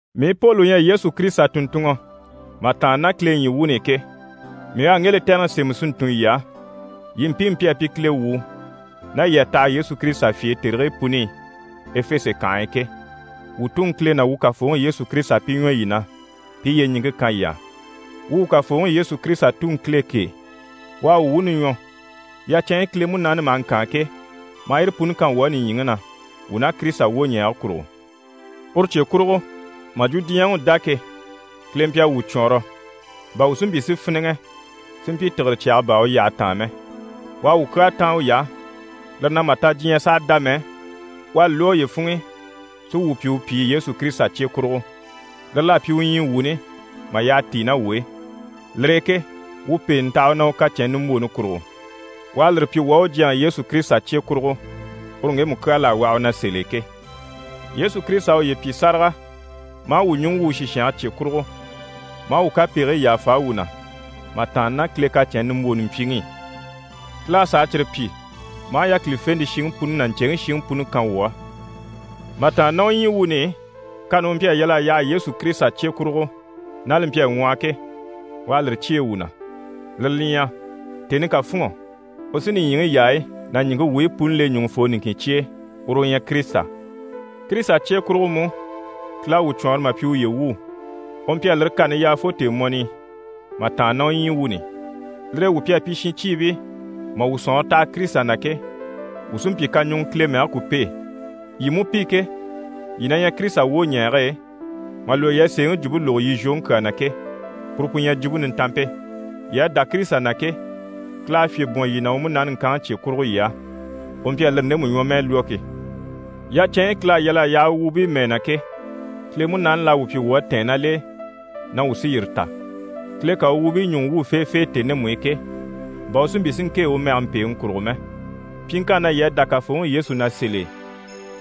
Mii Poli u ɲyɛ Yesu Kirisita tùnntunŋɔ mà tàanna ná Kile ɲyii wuuni i ke, mii u à ŋge lɛtɛrɛŋi sémɛ si ntun yii á, yii mpiimu pi à pyi Kile wuu, ná yii à taha Yesu Kirisita fye e tèrigii puni i [Efese kànhe e] ke. Wuu Tuŋi Kile ná wuu Kafooŋi Yesu Kirisita pi ɲwɔ yii na, pi i yyeɲiŋke kan yii á. Wuu wuu Kafooŋi Yesu Kirisita Tuŋi Kile kêe, u à wuu wuuni ɲwɔ, yacɛnɲyi Kile Munaani maha ŋkaan ke, maa yire puni kan wuu á nìɲyiŋi na, wuu ná Kirisita wwoɲɛɛge kurugo. Uru cye kurugo, mà jwo diɲyɛŋi u dá ke, Kile mpyi a wuu cwɔɔnrɔ, bà wuu si mpyi si fíniŋɛ, si mpyi tìgire cyaga baa u yyahe taan mɛ. U à wuu kyaa táan uy'á, lire na, mà ta diɲyɛ sàha dá mɛ, u à li lwɔ́ uye funŋ'i si wuu pyi u pyìi Yesu Kirisita cye kurugo. Lire l'à pyi u ɲyii wuuni mà yyaha tíi ná wuu e. Lire e ke wuu pèenɛ taha u na, u kacɛnni nimbwooni kurugo. U à lire pyi wuu á u Jyaŋi Yesu Kirisita cye kurugo, uru ŋgemu kyaa l'à waha u á sèl'e ke. Yesu Kirisita à uye pyi sáraga, maa wuu ɲùŋɔ wwû u sìshange cye kurugo, maa wuu kapegigii yàfa wuu na, mà tàanna ná Kile kacɛnni nimbwooni mpyiŋi i. Kile à sàa cyire pyi maa yákilifente shiŋi puni ná ɲcèŋi shiŋi puni kan wuu á. Mà tàanna ná u ɲyii wuuni i, kani u mpyi a yal'a yaha Yesu Kirisita cye kurugo, ná li mpyi a ŋwɔhɔ ke, u à lire cyêe wuu na. Lire li ɲyɛ: tèni ká fûnŋɔ, u sí nìɲyiŋi yaayi ná ɲìŋke wuyi puni le ɲùŋufoo niŋkin cye e, uru u ɲyɛ Kirisita. Kirisita cye kurugo mú, Kile à wuu cwɔɔnrɔ mà pyi uye wuu. U mpyi a lire kani yaa fo tèemɔni i mà tàanna ná u ɲyii wuuni i. Lire e wuu pi à pyi shincyiibii mà wuu sɔ̀nŋɔre taha Kirisita na ke, wuu sí n‑pyi kaɲuŋɔ Kile mɛge ku pêe. Yii mú pi ke, yii na ɲyɛ Kirisita wwoɲɛɛge e, mà lwɔ́ yii à sèeŋi jwumpe lógo yii zhwoŋi kyaa na ke, puru pu ɲyɛ Jwumpe Nintanmpe. Yii à dá Kirisita na ke, Kile à fyè bwɔ̀n yii na u Munaani ŋkanŋi cye kurugo yii á, u mpyi a lire ndemu ɲwɔmɛɛ lwɔ́ ke. Yacɛnɲyi Kile à yal'a yaha u wuubii mɛɛ na ke, Kile Munaani l'à wuu pyi wuu à tɛ̀ɛn ná l'e na wuu sí yire ta, Kile ká u wuubii ɲùŋɔ wwû feefee tèni ndemu i ke, bà u si mpyi si ŋkêe u mɛge mpèeŋi kurugo mɛ. Pyiŋkanni na yii à dá Kafooŋi Yesu na sèl'e,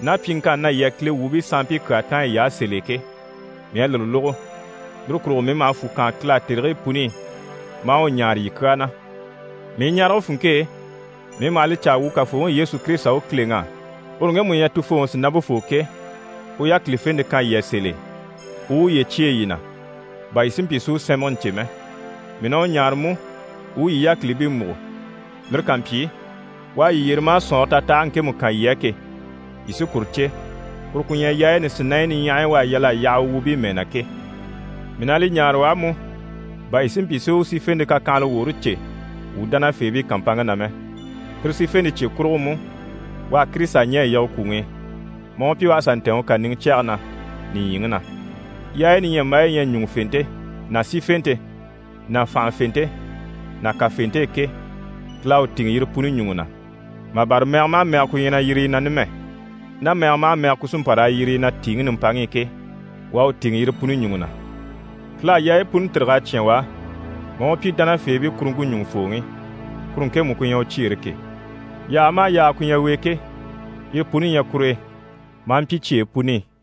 ná pyiŋkanni na yii à Kile wuubii sanmpii kyaa táan yiy'á sèl'e ke, mii à lire lógo. Lire kurugo mii maha fwù kaan Kile á tèrigii puni maa u ɲáare yii kyaa na. Mii ɲarege funŋke e, mii maha li caa wuu Kafooŋi Yesu Kirisita u Kileŋi á, uru ŋgemu u ɲyɛ Tufooŋi sìnampefoo ke, u yákilifente kan yii á sèl'e, u u uye cyêe yii na, bà yii si mpyi si u sɛ́nmɛgɛ ɲcè mɛ. Mii na u ɲáare mú u u yii yákilibii múgo. Lire ká mpyi, u à yii yyere maa sɔ̀nŋɔre tatahage ŋkemu kan yii á ke, yii sí kuru cè, kuru ku ɲyɛ yaayi nisinaɲyi niɲyahayi u à yal'a yaha u wuubii mɛɛ na ke. Mii na li ɲáare u á mú, bà yii si mpyi si u sífente kakyanhala woore cè wuu dánafeebii kàmpanŋke na mɛ. Tire sífente cye kurugo mú, u à Kirisita ɲɛ̀ a yige kwùŋi i, maa u pyi u à sà ntɛ̀ɛn u kàniŋɛ cyɛge na, nìɲyiŋi na. Yaayi niɲyambaayi yi ɲyɛ ná ɲùŋufente ná sífente ná fànhafente ná kafente e ke, Kile à u tìŋɛ yire puni ɲùŋɔ na, mà bâra mɛgɛ maha mɛgɛ ku ɲyɛ na yiri yi na numɛ, ná mɛgɛ maha mɛgɛ ku sí n‑pa raa yiri yi na tìiŋi nimpaŋi i ke, u à u tìŋɛ yire puni ɲùŋɔ na. Kile à yaayi puni tîrig'a cyán u á, maa u pyi dánafeebii kuruŋke ɲùŋufooŋi, kuru ŋkemu ku ɲyɛ u cyeere ke. Yaaga maha yaaga ku ɲyɛ u e ke, yire puni ɲyɛ kur'e maa mpyi cyeyi puni i.